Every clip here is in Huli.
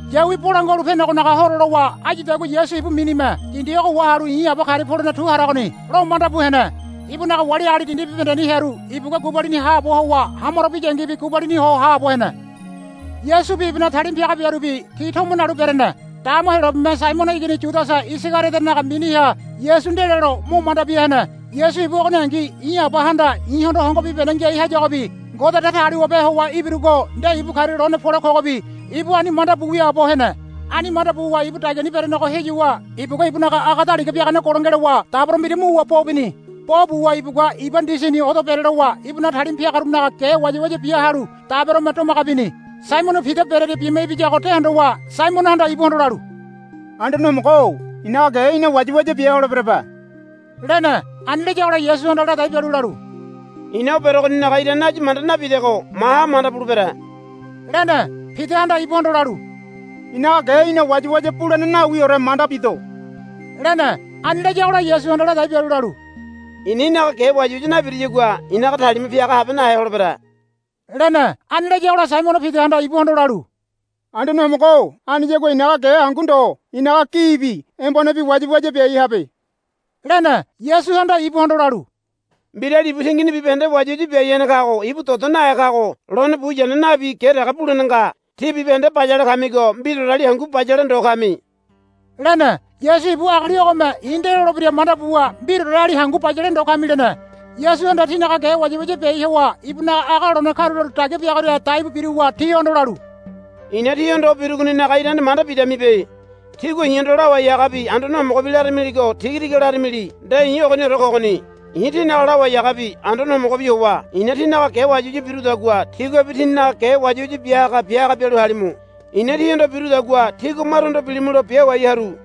Yawi Bolangua Halu Penegonaga Horo lowa áyudagua Yasu ibu minime, Dindi ogo wahalu i̱ Aba karia polene tu haragoni, lo manda bu hene. Ibunaga wali agali dindi bibahendeni hearu ibugua gubalini haabo howa hamaro biyangibi gubalini ho haabo hene. Yasubi ibunaga talima piagarubi ti tomo nalu berene. Dama Heyolabeme Saimono igini Yudasa Isagariodonaga miniha Yasu ndelelo mo manda bia hene. Yasu ibu ogoningi, I̱ Abahanda i̱hondo hongo bibahende ngiai hayagobi Ngode Datagaliwabe howa ibirugo nde ibu karia lone pole kogobi, ibu ani manda bu wiaabo hene. Ani manda buwa ibu dagiani berenego heyuwa ibugua ibunaga aga daliga biagane golo ngelowa dabero mbira muwa bo bini. Bo buwa ibugua iba ndisini odo berelowa ibunaga talima piagarunaga ge wayawaya bia halu daberome domaga bini. Saimono Pida berearia bima ibiyago de hondowa Saimonohanda ibuhondo lalu, Anduane Homogo-o i̱naga ge í̠na wayawaya bia holeberebe, lene. Ani layagola Yasuhanda ladai bialu lalu, I̱na o berogoninaga irane áyu manda nabidego maha manda bulebere, lene. Pidahanda ibuhondo lalu, I̱naga ge í̠na wayawaya bulene nawiore manda bido, lene. Ani layagola Yasuhanda ladai bialu lalu, I̱na í̠naga ge wayawaya nabiruyagua i̱naga talima piaga nahabehe holebere, lene. Ani layagola Saimono Pidahanda ibuhondo lalu, Anduane Homogo-o aniyagua i̱naga ge hangu ndo i̱naga gibi embonebi wayawaya biai habe, lene. Yasuhanda ibuhondo lalu, Mbirali ibu tingini bibahende wayawaya biai hene kago ibu dodo nahe kago lone buyane nabi ge dege bulene nga. Tí bibahende bayale kamigo mbiraoreli hangu bayale ndo kami, lene. Yasu ibu agali ogome i̱ nde lolebira manda buwa, Mbiraoreli hangu bayale ndo kami, lene. Yasuhanda tinaga ge wayawaya biai howa ibunaga aga lone karulalu dagia biagoria daibu biruwa tihondo lalu, I̱na tíhondo o birugoninaga irane manda bidamibe. Tígua i̱hondo, Lawai Hagabi Anduane Homogobi, laramiligo tiga tiga laramili nde i̱ ogoniore kogoni. I̱ tínaga Lawai Hagabi Anduane Homogobi howa i̱na tínaga ge wayawaya birudagua tíguabi tíninaga ge wayawaya bia haga bia haga bialu halimu. I̱na tíhondo birudagua tígua maruhondo bilimulo biawai haru.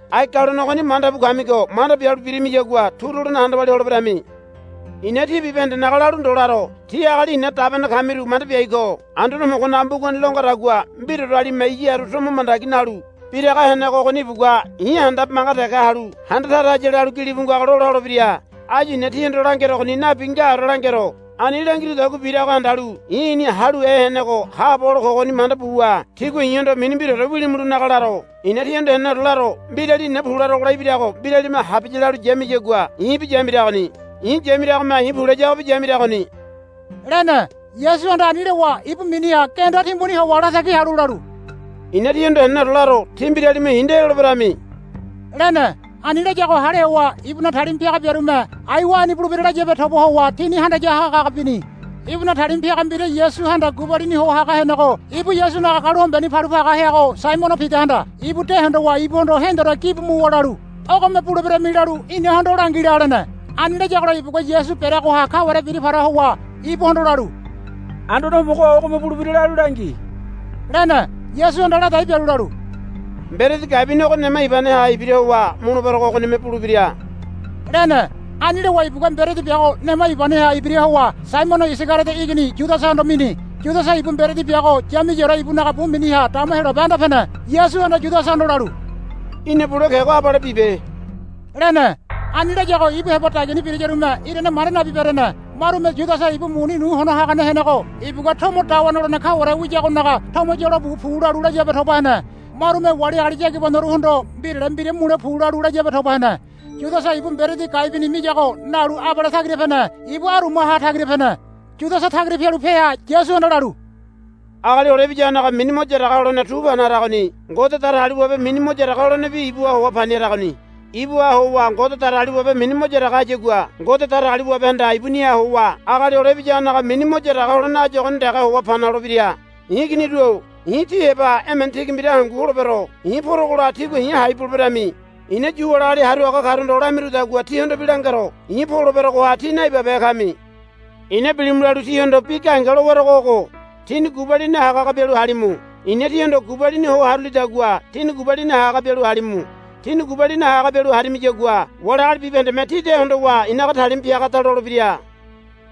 Ai galone ogoni manda bu kamigo manda bialu birimiyagua turu holene handa walia holeberami. I̱na tí bibahendenaga lalu ndo laro. Tí agali i̱na dabene kamiru manda biai ko. Anduane Homogonaga mbugani lo ngadagua, Mbiraorelime iya haru tomo mandagi nalu biraga henego ogoni ibugua i̱ handabe manga dege halu handa tara haya, lalu gilibu ngago lola holebira. Áyu i̱na tíhondo langerogoni nabi ngaore langero. Ani langirudagua birago handalu I̱ I̱ni Haluhe Henego Haabo Hole Kogoni manda buwa tígua i̱hondo mini mbiraore wilimulonaga laro. I̱na tíhondo heneneore laro. Mbirali i̱na pu larogola ibirago mbirame habiya lalu yamiyagua i̱bi yamiragoni. I̱ yamiragome i̱ pu layagobi yamiragoni, lene. Yasuhanda ani lowa ibu miniha genda timbuni howa latagi halu lalu, I̱na tíhondo heneneore laro. Tí mbiralime i̱ nde loleberami, lene. Ani layago hale howa ibunaga talima piaga biarume aiwa ani bulebira layabe toba howa tini handaya haga haga bini. Ibunaga talima piaga mbira Yasuhanda gubalini ho haga henego ibu Yasunaga galu hombeni palu paga heago Saimono Pidahanda ibu de hondowa ibuhondo hendore gibu muwa lalu, Ogome buleberami lalu inahondo langi la, lene. Ani layagola ibugua Yasu bereagoha kaware bira para howa ibuhondo lalu, Anduane Homogo-o ogome bulebira lalu langi, lene. Yasuhanda ladai bialu lalu, Mberedi gai bini ogo nema ibaneha ibira howa muleberogo ogonime bulebira, lene. Ani lowa ibugua mberedi biago nema ibaneha ibira howa Saimono Isagariodo igini Yudasahondo mini. Yudasa ibu mberedi biago yamiyaore ibunaga bu miniha dama Heyolabe anda pene. Yasuhanda Yudasahondo lalu, Í̠na bule kego abale bibe, lene. Ani layago ibu heba dagiani birayarume irane manda nabi berene. Marume Yudasa ibu muni nu hono hagane henego ibugua tomo dawa nolene kaware wiyagonaga tomo yolo bu pu lalu layabe toba hene. Marume wali agali yagibanoruhondo mbirale mbira mule pu lalu layabe toba hene. Yudasa ibu mberedi gai bini miyago nalu abale tagira pene. Ibu arumaha tagira pene. Yudasa tagira pialu peha Yasuhanda lalu, Agali Hole Ibiyagonaga mini mo yaraga holene tu pana haragoni. Ngode Datagaliwabe mini mo yaraga holenebi ibuha howa pani haragoni. Ibuha howa Ngode Datagaliwabe mini mo yaraga hayagua Ngode Datagaliwabehanda ibuniha howa Agali Hole Ibiyagonaga mini mo yaraga holene áyu ogoni dege howa pani holebira. I̱ iginiru-o i̱ tí heba emene tigi mbira hangu holebero. I̱ porogola tígua i̱ hai buleberami. I̱na Yu wali agali haru haga karuhondo lamirudagua tíhondobi langero. I̱ poleberogoha tí naibabehe kami. I̱na bilimu lalu tíhondo bi gahenge lowerogo ogo. Tíni gubalini haga haga bialu halimu. I̱na tíhondo gubalini ho harulidagua tíni gubalini haga haga bialu halimu. Tíni gubalini haga haga bialu harimiyagua wali agali bibahendeme tí de hondowa i̱naga talima piagada lolebira,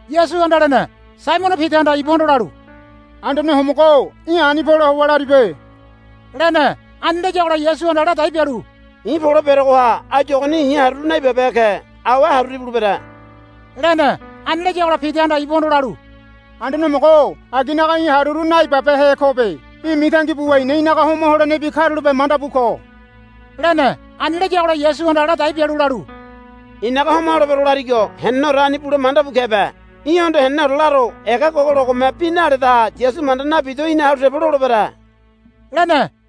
Yasuhanda lene. Saimono Pidahanda ibuhondo lalu, Anduane Homogo-o í̠ ani pole howa laribe, lene. Ani layagola Yasuhanda ladai bialu, I̱ poleberogoha áyu ogoni i̱ haruru naibabehe ke. Awe haruru ibulebere, lene. Ani layagola Pidahanda ibuhondo lalu, Anduane Homogo-o aginaga i̱ haruru naibabehe kobe. Í̠ mitangi buwa i̱na í̠naga homa holenebi karulape manda bu ko, lene. Ani layagola Yasuhanda ladai bialu lalu, I̱naga homa holebero larigo heneneore ani bule manda bu kebe. Í̠hondo heneneore laro. Ega gogologome bi naledaha Yasu manda nabido í̠na halu tebo lolebere, lene.